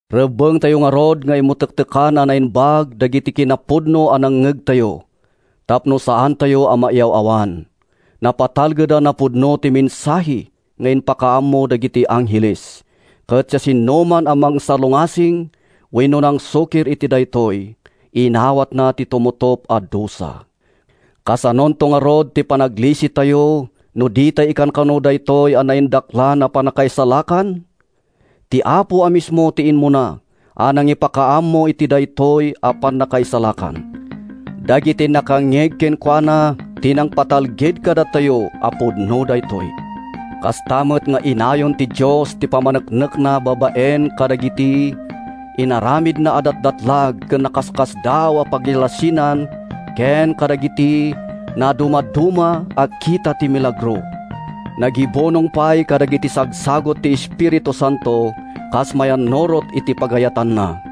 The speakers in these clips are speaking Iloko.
Rebbengtayo ngarud nga imutektekan a naimbag dagiti kinapudno a nangngegtayo tapno saantayo a mayaw-awan. Napatalgedan a pudno ti mensahe nga impakaammo dagiti angheles, ket siasinoman a nangsalungasing wenno nangsukir iti daytoy, inawatna ti tumutop a dusa. Kasanonto ngarud ti panaglisitayo no ditay ikankano daytoy a naindaklan a pannakaisalakan? Ti Apo a mismo ti immuna a nangipakaammo iti daytoy a pannakaisalakan. Dagiti nakangngeg kenkuana ti nangpatalged kadatayo a pudno daytoy. Kasta met nga innayon ti Dios ti pammaneknekna babaen kadagiti inaramidna a datdatlag ken nakaskasdaaw a pagilasinan ken kadagiti nadumaduma a kita ti milagro. Nagibunong pay kadagiti sagsagut ti Espiritu Santo kas mayannurot iti pagayatanna.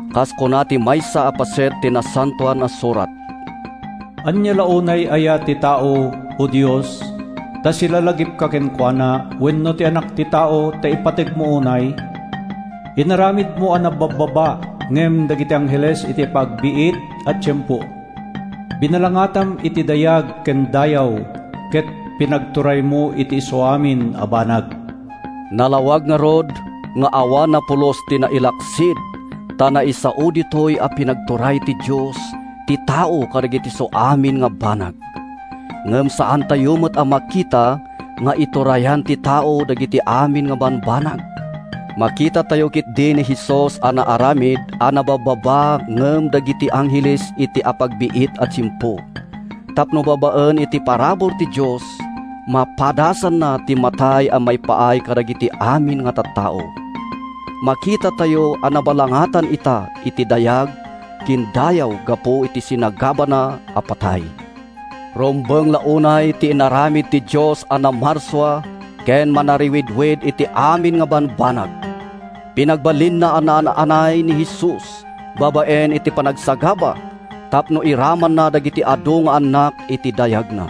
Kas kuna ti maysa a paset ti Nasantoan a Surat: “Ania la unay aya ti tao, O Dios, ta silalagipka kenkuana, wenno ti anak ti tao, ta ipategmo unay? Inaramidmo a nababbaba ngem dagiti angheles iti apagbiit a tiempo; binalangatam iti dayag ken dayaw, Ket pinagturaymo iti isuamin a banag.” Nalawag ngarud nga awan a pulos ti nailaksid ta naisao ditoy a pinagturay ti Dios ti tao kadagiti isuamin a banag. Ngem saantayo met a makita nga iturturayan ti tao dagiti amin a bambanag. Makitatayo ketdi ni Jesus a naaramid a nababbaba ngem dagiti angheles iti apagbiit a tiempo, tapno babaen iti parabur ti Dios, mapadasanna ti matay a maipaay kadagiti amin a tattao. Makitatayo a nabalangatan ita iti dayag ken dayaw gapu iti sinagabana a patay. Rumbeng la unay ti inaramid ti Dios a namarsua ken manarawidwid iti amin a bambanag: Pinagbalinna a naan-anay ni Jesus babaen iti panagsagaba tapno iramanna dagiti adu nga annak iti dayagna.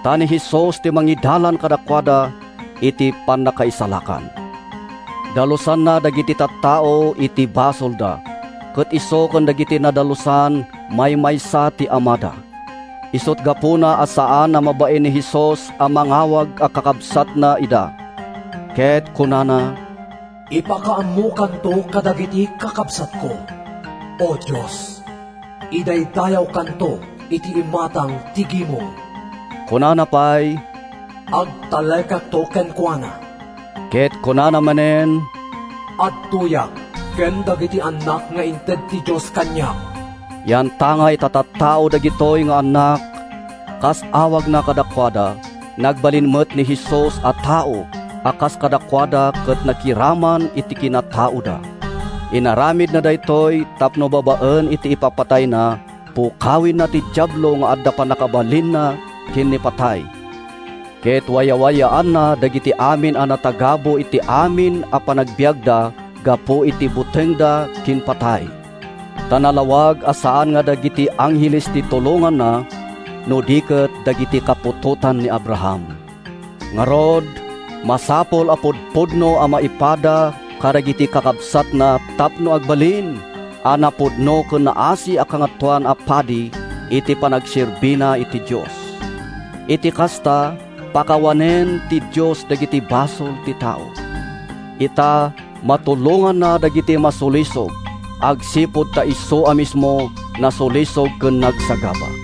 Ta ni Jesus ti mangidalan kadakuada iti pannakaisalakan. Dalusanna dagiti tattao iti basolda, ket isu ken dagiti nadalusan maymaysa ti Amada. Isut’ gapuna a saan a mabain ni Jesus a mangawag a kakabsatna ida, ket kunana, “Ipakaammokanto kadagiti kakabsatko, O Dios; Idaydayawkanto iti imatang ti gimong.” Kunana pay, “Agtalekakto kenkuana.” Ket kunana manen, “Adtoyak ken dagiti annak nga inted ti Dios kaniak.” Yantangay ta tattao dagitoy nga annak, kas awagna kadakuada, nagbalin met ni Jesus a tao a kas kadakuada ket nakiraman iti kinataoda. Inaramidna daytoy tapno babaen iti ipapatayna, pukawenna ti Diablo nga adda pannakabalinna ken ni patay, ket wayawayaanna dagiti amin a natagabu iti amin a panagbiagda gapu iti butengda ken patay. Ta nalawag a saan a dagiti angheles ti tulonganna, no di ket “dagiti kaputotan ni Abraham.” Ngarud, masapul a pudpudno a maipada kadagiti kakabsatna tapno agbalin a napudno ken naasi a Kangatoan a Padi iti panagserbina iti Dios. Iti kasta, pakawanen ti Dios dagiti basol ti tao. Ita, matulonganna dagiti masulisog, agsipud ta isu a mismo, nasulisog ken nagsagaba.